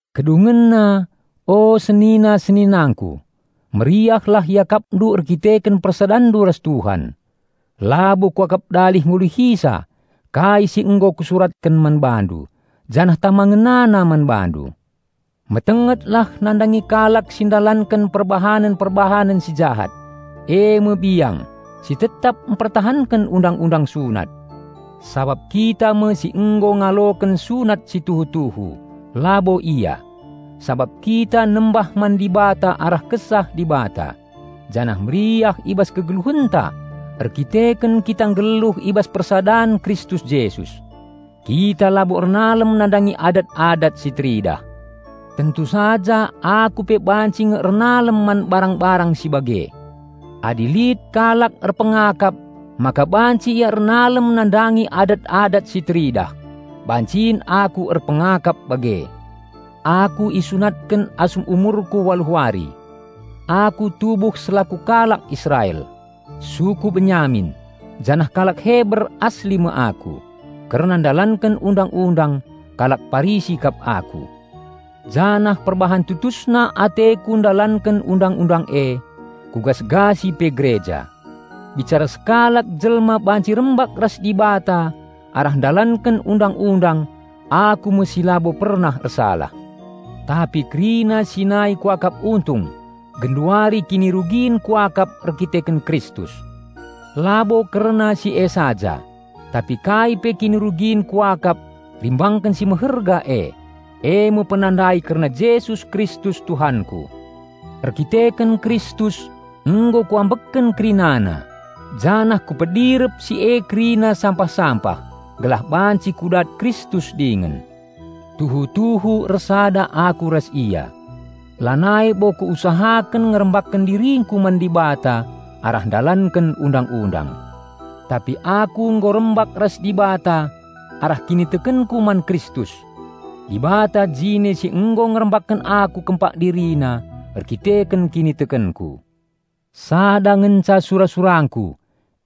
Kedungenna, o senina-seninangku, meriahlah iakapndu erkiteken persadanndu ras Tuhan. Labo kuakap dalih ngulihisa kai si nggo kusuratken man bandu, janah tama ngenana man bandu. Metengetlah nandangi kalak si ndalanken perbahanen-perbahanen si jahat, eme biang, si tetap mpertahanken undang-undang sunat. Sabap kita me si nggo ngaloken sunat si tuhu-tuhu, labo ia; sabap kita nembah man Dibata arah Kesah Dibata, janah meriah i bas kegeluhenta erdandanken kita nggeluh i bas persadan Kristus Jesus. Kita labo ernalem nandangi adat-adat si teridah. Tentu saja aku pe banci nge ernalem man barang-barang si bage. Adi lit kalak erpengakap maka banci ia ernalem nandangi adat-adat si teridah, bancin aku erpengakap bage. Aku isunatken asum umurku waluh wari. Aku tubuh selaku kalak Israel, suku Benyamin, janah kalak Heber asli me aku. Kerna ndalanken Undang-undang, kalak Parisi kap aku. Janah perbahan tutusna ateku ndalanken Undang-undang e, kugasgasi pe gereja. Bicara sekalak jelma banci rembak ras Dibata arah ndalanken Undang-undang aku me si labo pernah ersalah. Tapi kerina si nai kuakap untung, genduari kinirugin kuakap erdandanken Kristus. Labo kerna si e saja, tapi kai pe kinirugin kuakap rimbangken si meherga e, eme penandai kerna Jesus Kristus Tuhanku. Erdandanken Kristus, nggo kuambekken kerinana, janah kupedirep si e kerina sampah-sampah, gelah banci kudat Kristus dingen. Tuhu-tuhu ersada aku ras Ia. Lanai bo kuusahaken ngerembakken diringku man Dibata arah ndalanken Undang-undang. Tapi aku nggo rembak ras Dibata arah kinitekenku man Kristus. Dibata jine si nggo ngerembakken aku kempak DiriNa erdandanken kinitekenku. Sada ngenca sura-surangku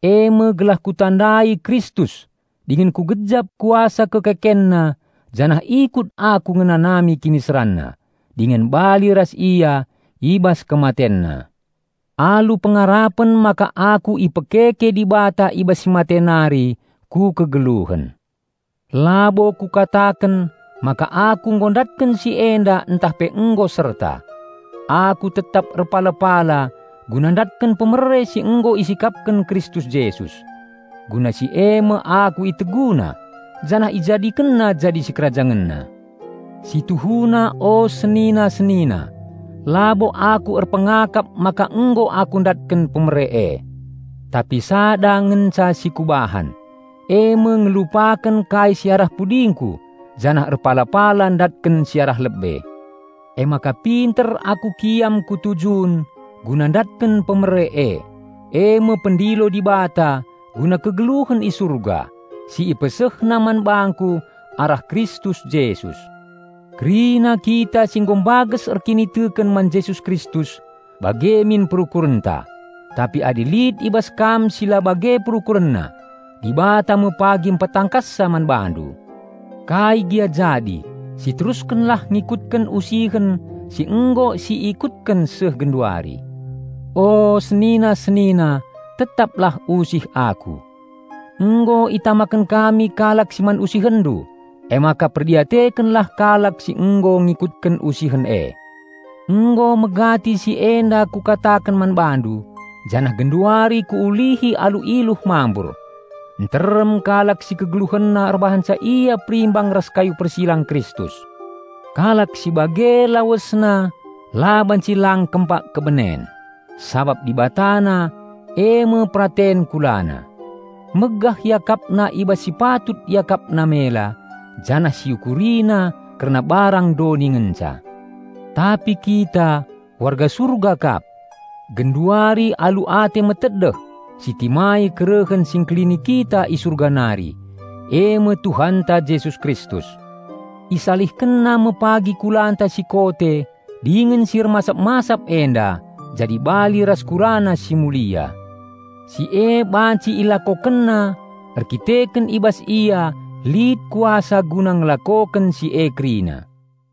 eme gelah kutandai Kristus dingen kugejap kuasa KekekenNa janah ikut aku ngenanami KiniseranNa, dingen bali ras Ia i bas KematenNa, alu pengarapen maka aku ipekeke Dibata i bas si mate nari ku kegeluhen. Labo kukataken maka aku nggo ndatken si enda ntah pe nggo serta. Aku tetap erpala-pala guna ndatken hadiah si nggo isikapken Kristus Jesus. Guna si eme aku IteguNa janah IjadikenNa jadi SikerajangenNa. Situhuna o senina-senina, labo aku erpengakap maka nggo aku ndatken hadiah e. Tapi sada ngenca si kubahan, eme ngelupaken kai si arah pudingku janah erpala-pala ndatken si arah lebe. Emaka pinter aku kiam ku tujun guna ndatken hadiah e, eme pendilo Dibata guna kegeluhen i Surga, si IpesehNa man bangku arah Kristus Jesus. Kerina kita si nggo mbages erkiniteken man Jesus Kristus bage min perukurenta. Tapi adi lit i bas kam si la bage perukurenna, Dibata me pagi mpetangkassa man bandu. Kai gia jadi, siteruskenlah ngikutken usihen si nggo siikutken seh genduari. O, senina-senina tetaplah usih aku. Nggo itamaken kami kalak si man usihenndu, emaka perdiatekenlah kalak si nggo ngikutken usihen e. Nggo megati si enda kukataken man bandu, janah genduari kuulihi alu iluh mambur: nterem kalak si kegeluhenna erbahanca ia perimbang ras kayu persilang Kristus. Kalak si bage lawesna la banci lang kempak kebenen, sabap dibatana, eme peraten kulana. Megah iakapna i bas si patut iakapna mela, janah si iukurina kerna barang doni ngenca. Tapi kita, warga Surga kap. Genduari alu ate metedeh sitimai kerehen si Engkelini kita i Surga nari, eme Tuhanta Jesus Kristus. IsalihkenNa me pagi kulanta si kote dingen si ermasap-masap enda, jadi bali ras KulaNa si mulia. Si e banci IlakokenNa erkiteken i bas Ia lit kuasa guna ngelakoken si e kerina.